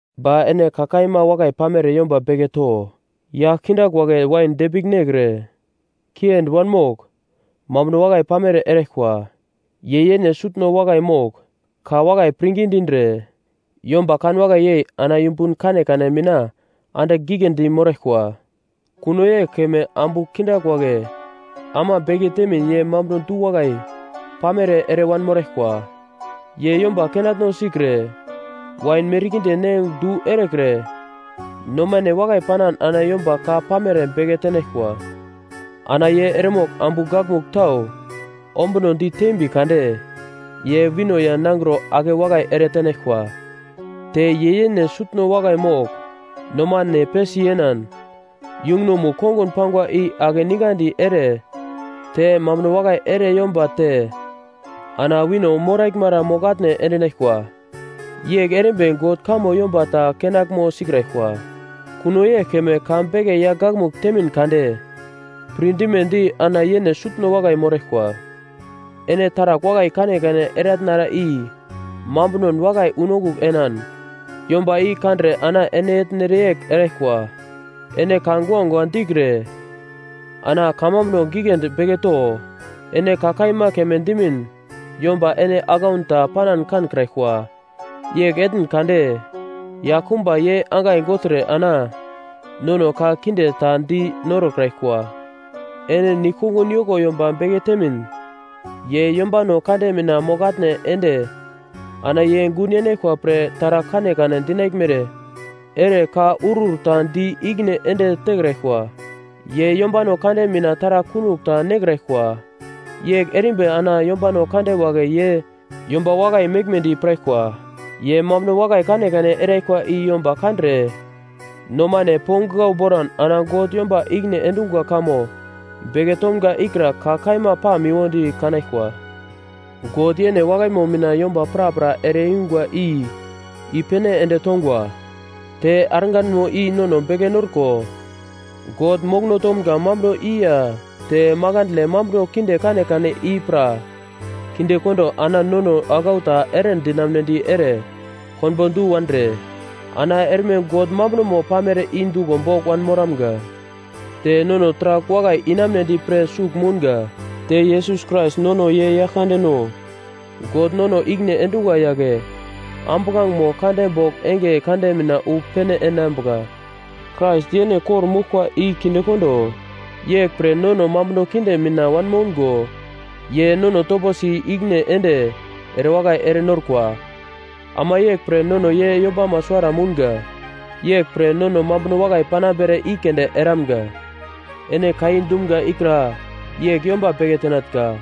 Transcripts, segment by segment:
Ba ene ka kaima wakai pamere yomba beke to. Yagl kindagl wagle wain depigl nekre, kiendi wanmogl, mambuno wakai pamere eraglkwa. Ye yene sutno wakai mogl, ka wakai pirngi dindre, yomba kanwakai yei ana yumbun kanekane mina andigl giglendi moraglkwa. Kuno yegl keme ambu kindagl wagle ama beke temin ye mambuno du-wakai pamere ere wanmoraglkwa. Ye yomba kenatno sikre wain merkinde ne du erekre nomane wakai panan ana yomba ka pamere beke tenaglkwa. Ana ye eremogl ambu gakmugl tau ombunodi teimbi kade, ye wino ya nangro ake wakai ere tenaglkwa. Te ye yene sutno wakai mogl nomane pesi yenan, yungunomugl kongun pangwa i ake ningadi ere te mambuno wakai ere yomba te ana wino moraglmara mogl-atne endinaglkwa. Yegl erimbi God kamo yomba ta kenaglmo sikraglkwa. Kuno yegl keme ka beke yagl gakmugl temin kade pirdimedi ana yene sutno wakai moraglkwa. Ene taragl wakai kanekane eratnara i mambunon wakai unongugl enan, yomba i kandre ana ene etnere yegl eraglkwa. Ene ka guagua dikre ana kamambuno giglendi beke to. Ene ka kaima keme dimin yomba ene aglaun ta panan kankraglkwa. Yegl etn kade yaglkumba ye angai gogltre ana nono ka kinde ta di norokraglkwa. Ene nigl-kongun yoko yomba beke temin ye yombano kande mina mogl-atne ende ana ye gun yenaglkwa pre taragl kanekane dinaglmere ere ka urur ta di ikine ende tekraglkwa. Ye yombano kande mina taragl kunogl ta nekraglkwa yegl erimbi ana yombano kande wagle ye yomba wakai meglmedi piraglkwa. Ye mambuno wakai kanekane eraglkwa i yomba kandre nomane ponglau boran ana God yomba ikine endungwa kamo beke tomga ikra ka kaima pamiwodi kanaglkwa. God yene wakaimo mina yomba prapra ere-yungwa i i-pene ende tongwa. Te arganmo i nono beke norko God mokono tomga mambuno i ya te makandle mambuno kinde kanekane i pra kinde kondo ana nono aglau ta eredinamnedi ere konbo du wandre ana erme God mambunomo pamere i duglo bogl wanmoramga. Te nono taragl wakai inamunedi pre sugl mounga. Te Yesus Krais nono ye Yaglkande no God nono ikine endungwa yagle ambuglangemo kande bogl enge kande mina wu pene enambuka, Krais yene kor-moglkwa i kinde kondo yeglpre nono mambuno kinde mina wanmoungo ye nono toposi ikine ende erewakai ere norkwa. Ama yeglpre nono ye yombamo suwara mounga, yeglpre nono mambuno wakai panambere i keunde eramunga. Ene ka i dumga ikra yegl yomba beke tenatnga.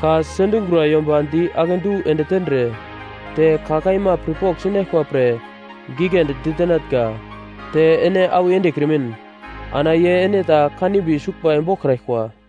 Ka sendingura yomba di akedu ende tendre te ka kaima pirpogl sinaglkwa pre giglendi ditenatnga. Te ene awi endekrimin ana ye ene ta kanimbi suglbai boglkraglkwa.